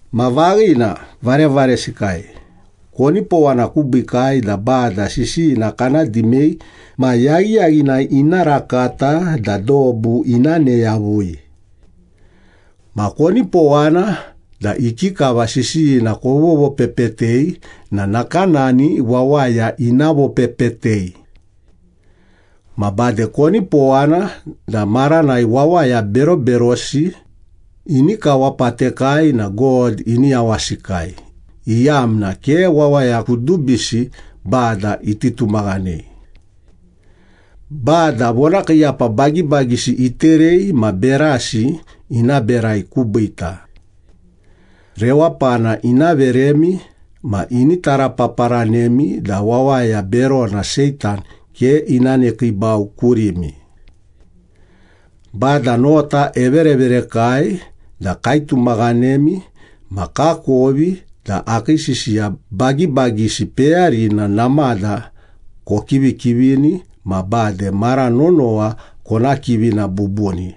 Ma vaghina, varevaresikai, konipowana kubiikai da Bada sisiyina kana dimei ma yaghiyaghinai ina rakata da dobu ina ne yavui. Ma konipowana da ikikava sisiyina kovovopepetei na nakanani wawaya ina vopepetei. Ma bade konipowana da maranai wawaya beroberosi ini kawapatekai na God ini yawasikai, iyamna ke wawaya kudubisi Bada iti tumaghanei. Bada vonakiiyapa bagibagisi iterei ma berasi ina berai kubiita. Rewapana ina veremi, ma ini tarapaparanemi da wawaya berona Seitan ke ina nekiibau kurimi. Bada nota evereverekai da kaitumaghanemi ma kakovi da akii sisiya bagibagisi peyarina namada kokivikivini ma bade mara nonowa kona kivina bubuni.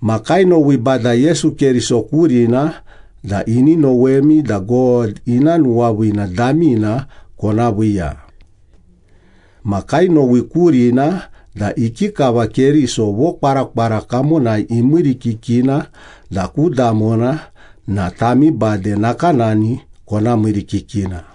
Ma kainowi Bada Yesu Keriso kurina da ini nowemi da God ina nuwaviina damina kona viiya. Ma kainowi kurina da ikikava Keriso vokwarakwara kamonai imiirikikina da ku damona na tami bade nakanani kona miirikikina.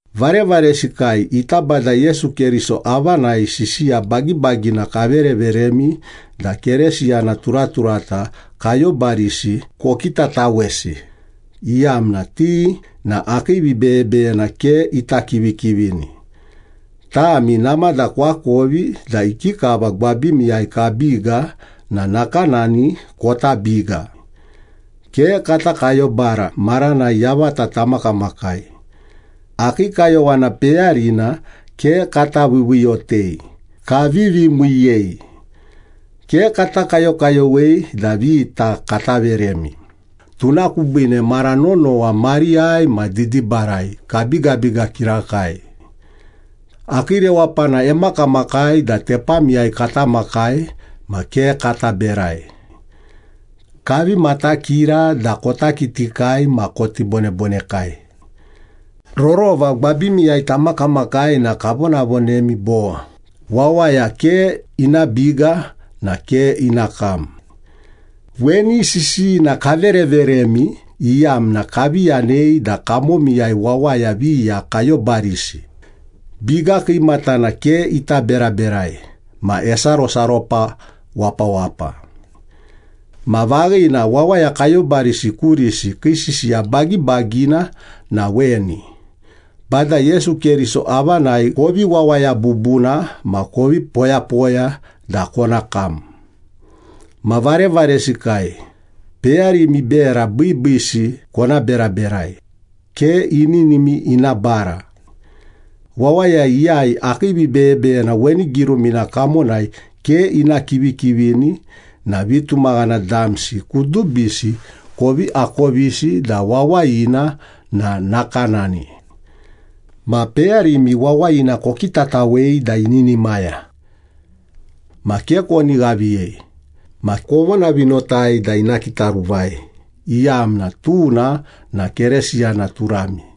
Varevaresikai, ita Bada Yesu Keriso avanai sisiya bagibagina kavereveremi da Keresiyana turaturata kayobarisi kokitatawesi, iyamna ti na akii vibeyebeyena ke ita kivikivini. Tami namada koakovi da ikikava gwabimiyai kabiga na nakanani kota biga. Ke kata kayobara maranai yavata tamakamakai. Akii kayowana peyarina ke kata viiviiyotei, kavivi miiyei. Ke kata kayokayowei da vita kata veremi, tuna kubiine mara nonowa mariyai ma didibarai kabigabiga kirakai. Akii rewapana emakamakai da tepamiyai kata makai ma ke kata berai. Kavi matakira da kota kitikai ma koti bonebonekai. Rorova gwabimiyai tamakamakai na kavonavonemi bo, “Wawaya ke ina biga na ke ina kam.” Weni sisiyina kavereveremi iyamna kavi yanei da kamomiyai wawaya viya kayobarisi, biga kiimatana ke ita beraberai, ma esarosaropa wapawapa. Ma vaghina, wawaya kayobarisi kurisi kii sisiya bagibagina na weni. Bada Yesu Keriso avanai kovi wawaya bubuna ma kovi poyapoya da kona kam. Ma varevaresikai, peyarimi bera biibiisi kona beraberai, ke ininimi ina bara. Wawaya iyai akii vibeyebeyena weni girumina kamonai ke ina kivikivini na vitumaghana damsi kudubisi kovi akovisi da wawayina na nakanani. Ma peyarimi wawayina kokitatawei da ininimaya. Ma ke koni ghaviyei, ma kovonavinotai da ina kitaruvai, iyamna tuna na Keresiyana turami.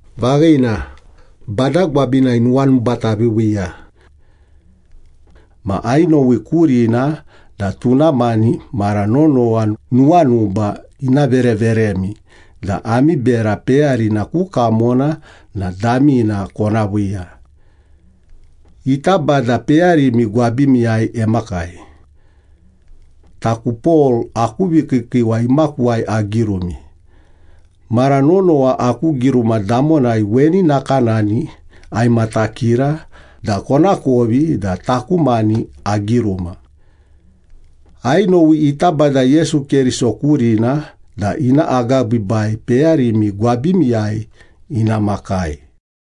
Vaghina, Bada gwabinai nuwanuba taviiviiya. Ma ainowi kurina da tuna mani mara nonowa nuwanuba ina vereveremi da ami bera peyarina ku kamona na damina kona viiya. Ita Bada peyarimi gwabimiyai emakai. Taku Pol aku vikiikiiwa imakuwai agirumi. Mara nonowa aku giruma damonai weni nakanani aimatakira da konakovi da taku mani agiruma. Ainowi ita Bada Yesu Keriso kurina da ina agabiibai peyarimi gwabimiyai ina makai.